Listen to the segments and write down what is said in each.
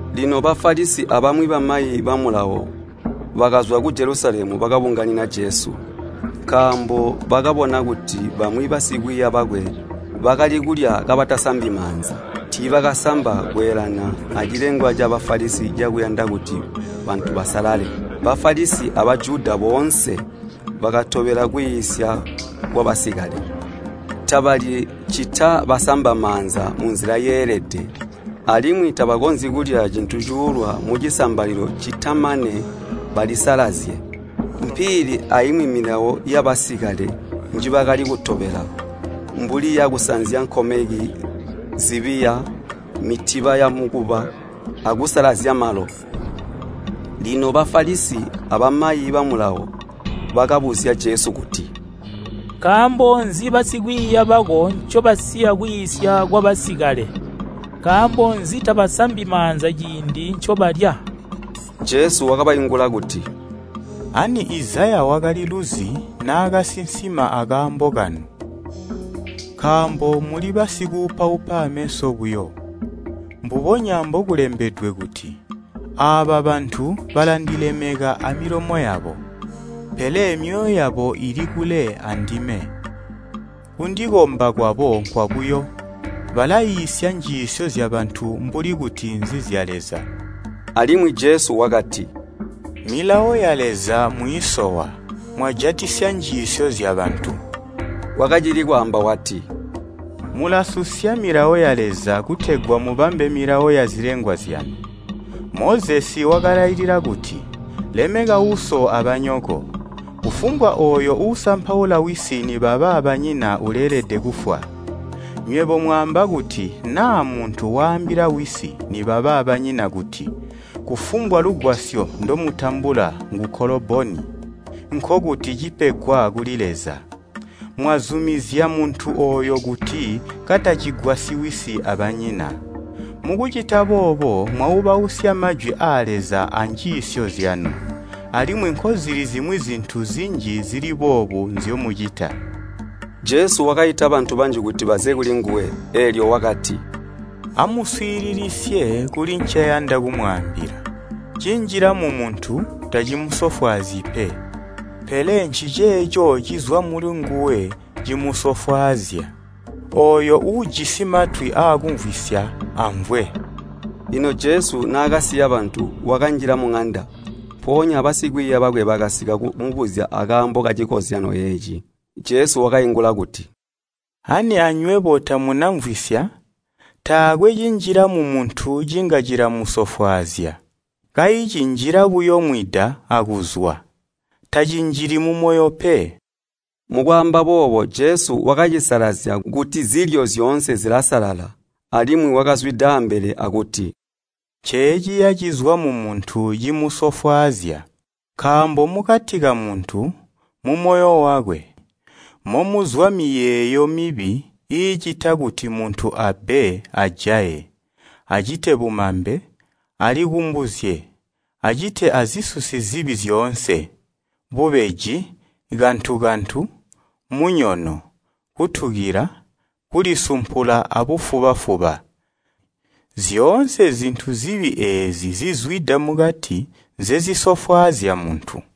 Lino Bafalisi abamwi bamayi ba Mulawo bakazwa ku Jelusalemu bakabunganina Jesu. Nkaambo bakabona kuti bamwi basikwiiya bakwe bakali kulya kabatasambi maanza, tiibakasamba kweendelana acilengwa ca Bafalisi cakuyanda kuti bantu basalale. Bafalisi a Bajuda boonse, batobela kwiisya kwabasikale. Tabalyi, ccita basamba maanza munzila yeelede, alimwi tabakonzyi kulya cintu cuulwa mucisambalilo ccita mane balisalazye. Mpiili aimwi milawo yabasikale njibakali kutobela, mbuli yakusanzya nkomeki zibiya, mitiba yamukuba, akusalazya malo. Lino Bafalisi abamayi ba Mulawo bakabuzya Jesu kuti, “Nkaambo nzi basikwiiya bako ncobasiya kwiisya kwabasikale? Nkaambo nzi tabasambi maanza ciindi ncobalya?” Jesu wakabaingula kuti, “Ani Izaya wakaliluzi naakasinsima akaambo kanu! Nkaambo muli basikuupaupa ameso buyo, mbubonya mbokulembedwe kuti, ‘Aaba bantu balandilemeka amilomo yabo, pele myoyo yabo ili kule andime. Kundikomba kwabo nkwabuyo, balaiisya njiisyo zyabantu mbuli kuti nzizya Leza!’” Alimwi Jesu wakati, “Milawo ya Leza mwiisowa, mwajatisya njiisyo zyabantu.” Wakacili kwaamba wati, “Mulasusya milawo ya Leza kutegwa mubambe milawo yazilengwa zyanu. Mozesi wakalailila kuti, ‘Lemeka uso abanyoko,’ ‘Kufumbwa ooyo uusampaula wisi nibaba banyina uleelede kufwa.’ Nywebo mwaamba kuti naa muntu waambila wisi nibaba banyina kuti, kufumbwa lugwasyo ndomutambula ngu ‘Koloboni’ (nkokuti cipegwa kuli Leza), mwazumizya muntu ooyo kuti katacigwasyi wisi abanyina. Mukucita boobo mwaubausya majwi aa Leza anjiisyo zyanu. Alimwi nkozili zimwi zintu zinji zili boobu nzyomucita.” Jesu wakaita bantu banji kuti baze kuli nguwe, eelyo wakati, “Amuswiililisye kuli nceyanda kumwaambila. Cinjila mumuntu tacimusofwaazyi pe. Pele nciceeco cizwa mulinguwe cimusofwaazya. Ooyo uujisi matwi aakumvwisya amvwe.” Lino Jesu naakasiya bantu, wakanjila muŋanda, mpoonya basikwiiya bakwe bakasika kumubuzya akaambo kacikozyanyo eeci. Jesu wakaingula kuti, “Ani anywebo tamuna mvwisya? Taakwe cinjila mumuntu cinga cilamusofwaazya. Kayi cinjila buyo mwida akuzwa, tacinjili mumoyo pe.” (Mukwaamba boobo Jesu wakacisalazya kuti zilyo zyoonse zilasalala.) Alimwi wakazwida ambele akuti, “Nceeciya cizwa mumuntu cimusofwaazya. Nkaambo mukati kamuntu, mumoyo wakwe, momuzwa miyeeyo mibi iicita kuti muntu abbe ajaye, acite bumambe, alikumbuzye, acite azisusi zibi zyoonse, bubeji, kantu-kantu, munyono, kutukila, kulisumpula abufuba-fuba. Zyoonse zintu zibi eezi zizwida mukati nzezisofwaazya muntu.”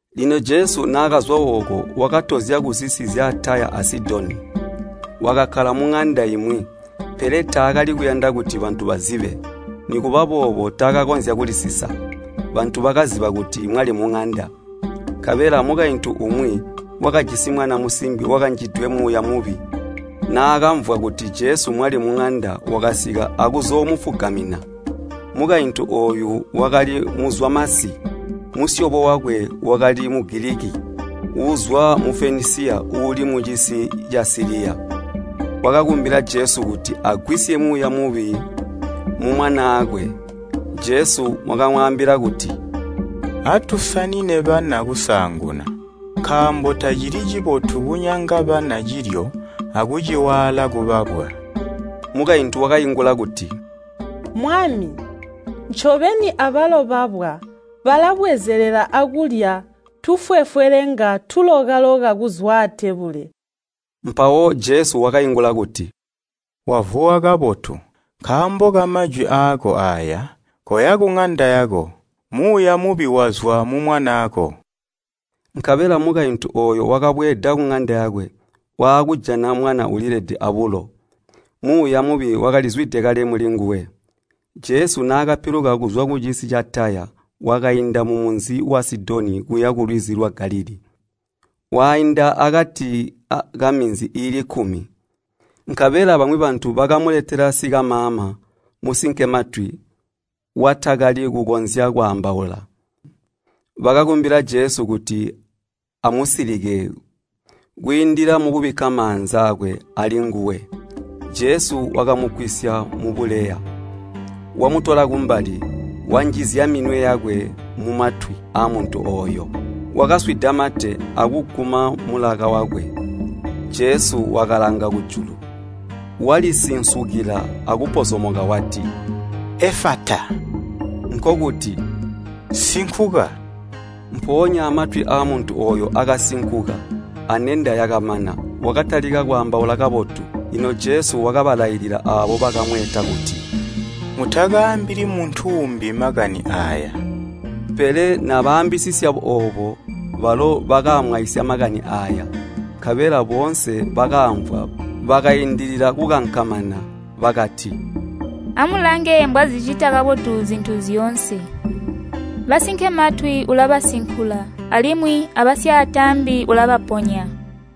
Lino Jesu naakazwa ooko, wakatozya kuzisi zya Taya a Sidoni. Wakakkala muŋanda imwi, pele taakali kuyanda kuti bantu bazibe. Nikuba boobo taakakonzya kulisisa, bantu bakaziba kuti mwali muŋanda. Nkabela mukaintu umwi, wakajisi mwana musimbi wakanjidwe muuya mubi naakamvwa kuti Jesu mwali muŋanda wakasika akuzoomufugamina. Mukaintu ooyu wakali muzwamasi, musyobo wakwe wakali Mufenisiya uuli mucisi ca Siliya. Wakakumbila Jesu kuti agwisye muuya mubi mumwanaakwe. Jesu wakamwaambila kuti, “Atusanine bana kusaanguna, nkaambo tacili cibotu kunyanga bana cilyo akuciwaala kubabwa.” Mukaintu wakaingula kuti, “Mwami, ncobeni abalo babwa balabwezelelela akulya tufwefwelenga tuloka-loka kuzwa atebule!” Mpawo Jesu wakaingula kuti, “Wavuwa kabotu, nkaambo kamajwi aako aaya koya kuŋanda yako, muuya mubi wazwa mumwanaako!” Nkabela mukaintu ooyo wakabweeda kuŋanda yakwe, waakujana mwana ulilede abulo. Muuya mubi wakalizwide kale mulinguwe. Jesu naakapiluka kuzwa kucisi ca Taya, wakainda mumunzi wa Sidoni kuya kulwizi lwa Galilii, wainda akati ka Minzi iili kkumi. Nkabela bamwi bantu bakamuletela sikamaama, musinkematwi, watakali kukonzya kwaambaula, bakakumbila Jesu kuti amusilike kwiindila mukubikka maanza aakwe alinguwe. Jesu wakamugwisya mubuleya, wamutola kumbali, wanjizya minwe yakwe mumatwi aamuntu ooyo. Wakaswida mate akuguma mulaka wakwe. Jesu wakalanga kujulu, walisinsukila akupozomoka wati, “Efata,” nkokuti, “Sinkuka!” Mpoonya matwi aamuntu ooyo akasinkuka, anenda yakamana, wakatalika kwaambaula kabotu. Lino Jesu wakabalailila aabo bakamweeta kuti, “Mutakaambili muntu uumbi makani aaya!” Pele balo bakamwaisya makani aaya. Nkabela boonse bakaamvwa bakaindilila kukankamana, bakati, “Amulange mbwazicita kabotu zintu zyoonse! Basinkematwi ulabasinkula alimwi abasyaataambi ulabaponya!”